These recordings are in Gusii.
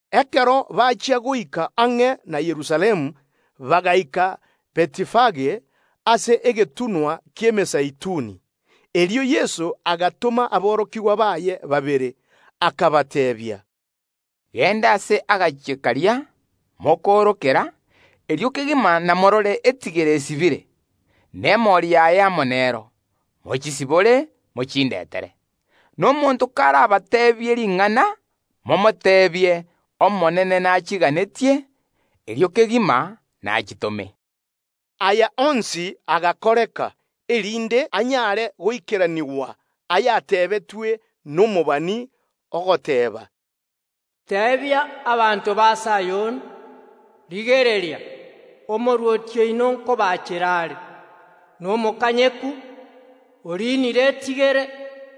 Ekero bachia goika ang’e na Yerusalemu, bagaika Betifage, ase egetunwa ki’Emezeituni. Erio Yeso agatoma aborokigwa baye babere, akabateebia, “Genda ase ekenyoro keria kere bosio bwaino, erio kegima namorore etigere esibire, na emori yaye amo nero; mochisibore mochindetere. Na omonto karabateebie ring’ana, momoteebie: Omonene nachiganetie; erio kegima nachitome.” Aya onsi agakoreka, erinde anyare goikeranigwa ayatebetwe nomobani, ogoteeba, “Teebia abanto ba Sayoni, Rigereria, Omorwoti oino nkobaachera are, nomokanyeku, oriinire etigere,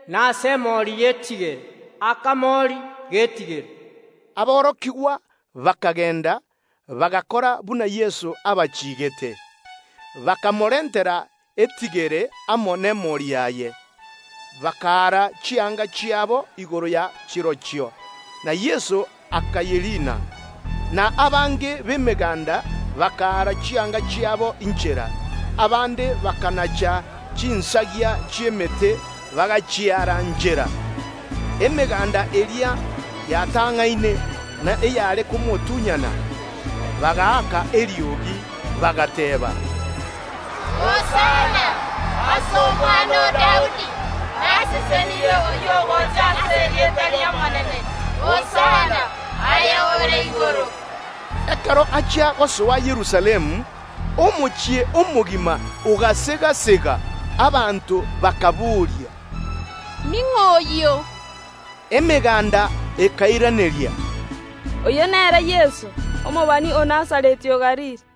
nase emori y’etigere, akamori g’etigere.” Aborokigwa bakagenda, bagakora buna Yeso abachiigete. Bakamorentera etigere amo nemori yaye, bakaara chianga chiabo igoro ya chirochio, na Yeso akayeriina. Na abange b’emeganda bakaara chianga chiabo inchera; abande bakanacha chinsagia chi’emete bagachiaara nchera. Emeganda eria yatang’aine, na eyare komotunyana, bagaaka eriogi, bagateeba, “Hosana ase Omwana o Daudi! Nasesenirie oyio ogocha ase erieta ri’Omonene! Hosana, aye ore igoro mono!” Ekero achia gosoa Yerusalemu, omochie omogima ogasega‐sega, abanto bakabooria, “Ning’o oyio?” Emeganda ekairaneria, “Oyio nere Yeso, omobani o Nazareti ya Galili.”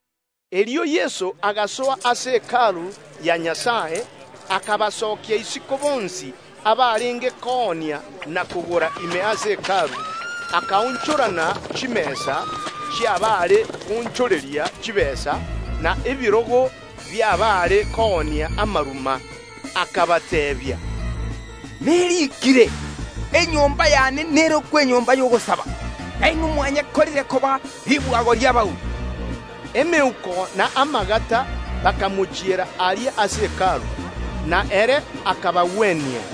Erio Yeso agasoa ase Hekalu ya Nyasae, akabasokia isiko bonsi abarenge koonia na kogora ime ase Hekalu, akaonchorana chimesa chi’abaare koonchoreria chitaabu, na ebirogo bi’abaare koonia amaruma. Akabateebia, “Neriikire: Enyomba y’ane nerokwe enyomba y’ogosaba, na inwe mwayekorire koba ribwago ri’abauri.” Emeuko na amagata bakamochiera aria ase Hekalu, na ere akabagwenia.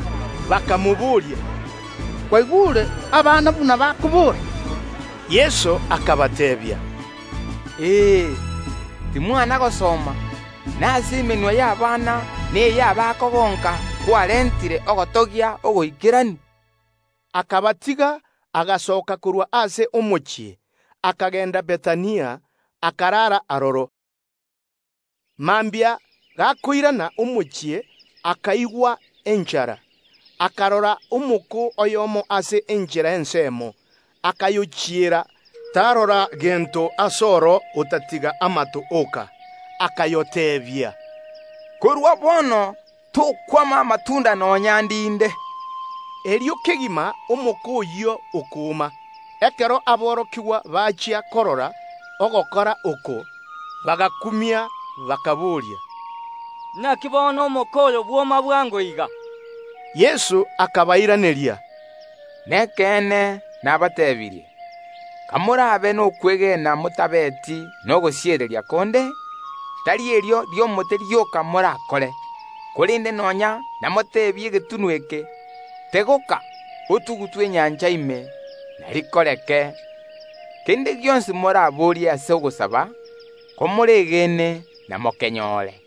Bakamobooria, “Kwaigure abana buna bakobora?” Yeso akabateebia, Ee; timwana gosoma: Nase emenwa y’abana na ey’abakogonka kwerenteire ogotogia ogoikeranu? Akabatiga, agasoka korwa ase omochie, akagenda Bethania, akarara aroro. Mambia gakoirana omochie, akaigwa enchara. Akarora omoko oyomo ase enchera ensemo, akayochiera, tarora gento asoro otatiga amato oka. Akayoteebia, “Korwa bono tokwama amatunda nonya ndinde.” Erio kegima omoko oyio okoma. Ekero aborokigwa bachia korora ogokora oko, bagakumia, bakabooria, “Inaki bono omoko oyo bwoma bwango iga?” Yeso akabairaneria, “Nekeene nabateebirie; Komorabe nokwegena motabeti na tangutangu chinde, tari erio ri’omoko rioka morakore, korende ’namoteebie egetunwa eke: Tegoka, otugutwe enyancha ime, na rikoreke. Kende gionsi moraborie ase ogosaba, komoregeene namokenyore.”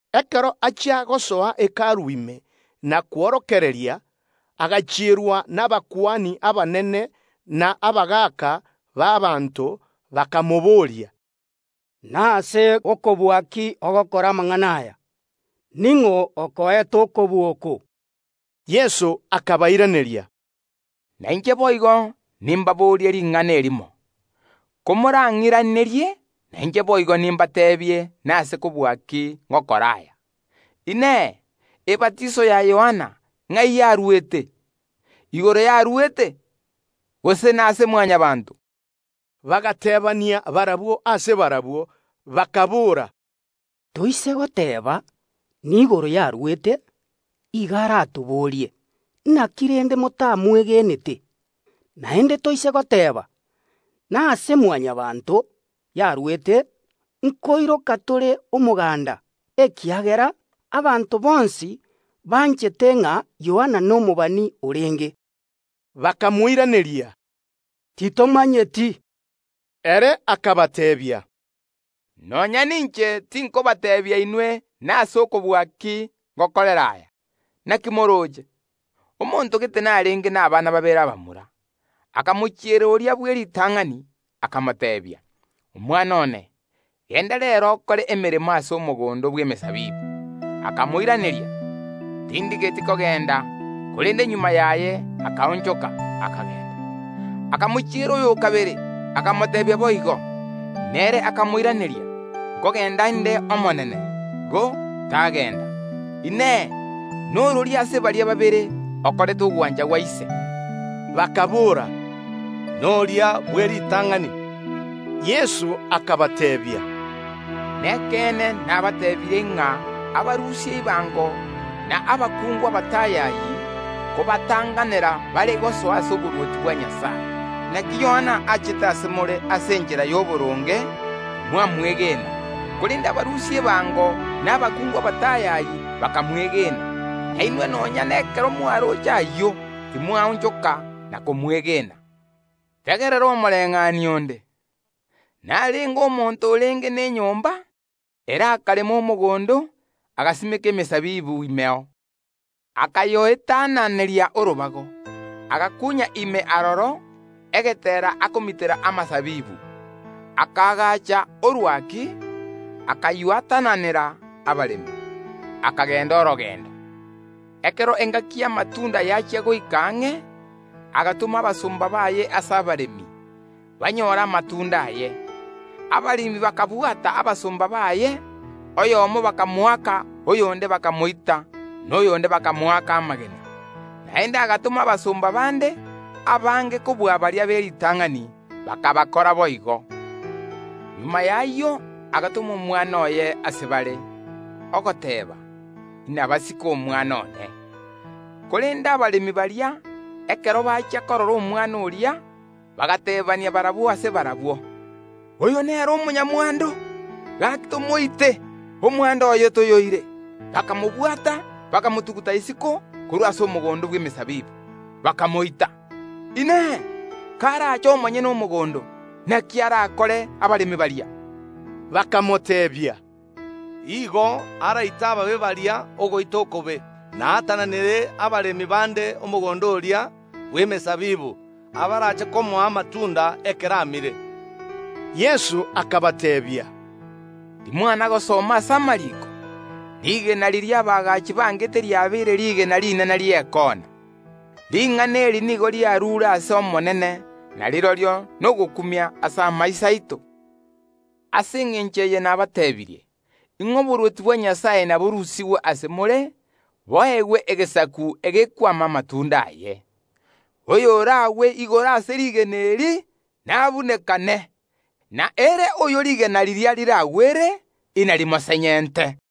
Ekero achia gosoa Hekalu ime na kworokereria, agachierwa nabakuani abanene na etureti y’abanto, bakamobooria, “Nase okobua ki ogokora amang’ana aya? Ning’o okoete okobua oko?” Yeso akabairaneria, “Nainche boigo nimbaboorie ring’ana erimo, komorang’iranerie, nainche boigo nimbateebie nase okobua ki ngokora aya. Inee! Ebatiso ya Yohana, ng’ai yarwete? Igoro yarwete, gose nase Mwanyabaanto?” Bagateebania barabwo ase barabwo, bakaboora, “Toise goteeba: Niigoro yarwete, igo aratoborie: Inaki rende motamwegenete? Naende toise goteeba: Nase Mwanyabaanto yarwete, nkoiroka tore omoganda, ekiagera abanto bonsi banchete ng’a Yohana nomobani orenge.” Bakamoiraneria, “Titomanyeti.” Ere akabateebia, “Nonya ninche tinkobateebia inwe nase kobua ki ngokora aya. “Inaki morooche? Omonto gete narenge nabana babere abamura. Akamochiera oria bw’eritang’ani, akamoteebia: Omwana one, genda reero okore emeremo ase omogondo bw’emesabibu. Akamoiraneria: Tindigeti kogenda, korende magega yaye akaonchoka, akagenda. Akamochiera oy’okabere, akamoteebia boigo. Nere akamoiraneria: Nkogenda inde, omonene; ko tagenda. Inee! Norori ase baria babere okorete ogwancha gwa ise?” Bakaboora, “Noria bw’eritang’ani.” Yeso akabateebia, “Nekeene nabateebirie ng’a abarusia ebango na abakungu abatayayi nkobatang’anera bare gosoa ase oborwoti bwa Nyasae. Inaki Yohana nigo achete ase more ase enchera y’oboronge, timwamwegena; korende abarusia ebango na abakungu abatayayi bakamwegena; na inwe nonya nekero mwaroche ayio, timwaonchoka na komwegena. “Tegerera omobayeeno onde. Narenge omonto omonyene omochie; ere akarema omogondo, agasimeka emesabibu imeo, akayoetananeria orobago, agakuunya ime aroro egeteera akomitera amasabibu, akaagaacha orwaki, akaywatananera abaremi, akagenda orogendo. Ekero engaki y’amatunda yachia goika ang’e, agatoma abasomba baye ase abaremi, banyore amatunda aye. Abaremi bakabwata abasomba baye, oyomo bakamoaka, oyonde bakamoita, na oyonde bakamoaka amagena. Naende agatoma abasomba bande, abange kobua baria b’eritang’ani; bakabakorera boigo. Omoerio oye agatoma omwana oye ase bare, ogoteeba: Inabasike omwana one. Korende abaremi baria, ekero bachia korora omwana oria, bagateebania barabwo ase barabwo: Oyo nere omonyamwando; gaki tomoite, omwando oye toyoire. Bakamobwata, bakamotuguta isiko korwa ase omogondo bw’emesabibu, bakamoita. Inee! Karache omonyene omogondo, naki arakore abaremi baria?” Bakamoteebia, “Igo araite abamwamu baria ogoita okobe, na aatananere abaremi bande omogondo oria bw’emesabibu, abarache komoa amatunda ekero amire.” Yeso akabateebia, Timwana gosoma ase amariiko: Rigena riria abaagachi bangete riabeire rigena rinene ri’ekoona. Ring’ana eri nigo riarure ase Omonene, na rirorio nogokumia ase amaiso aito? Ase engencho eye nabateebirie, ng’a oborwoti bwa Nyasae naborusigwe ase more, boegwe egesaku egekwama amatunda aye. [ Oyoragwe igoro ase rigena eri nabunekane, na ere oyo rigena riria riragwere inarimosenyente.]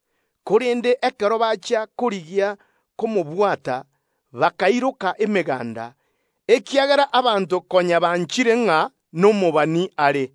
Korende ekero bachia korigia komobwata, bakairoka emeganda, ekiagera abanto konya banchire ng’a ere nomobani.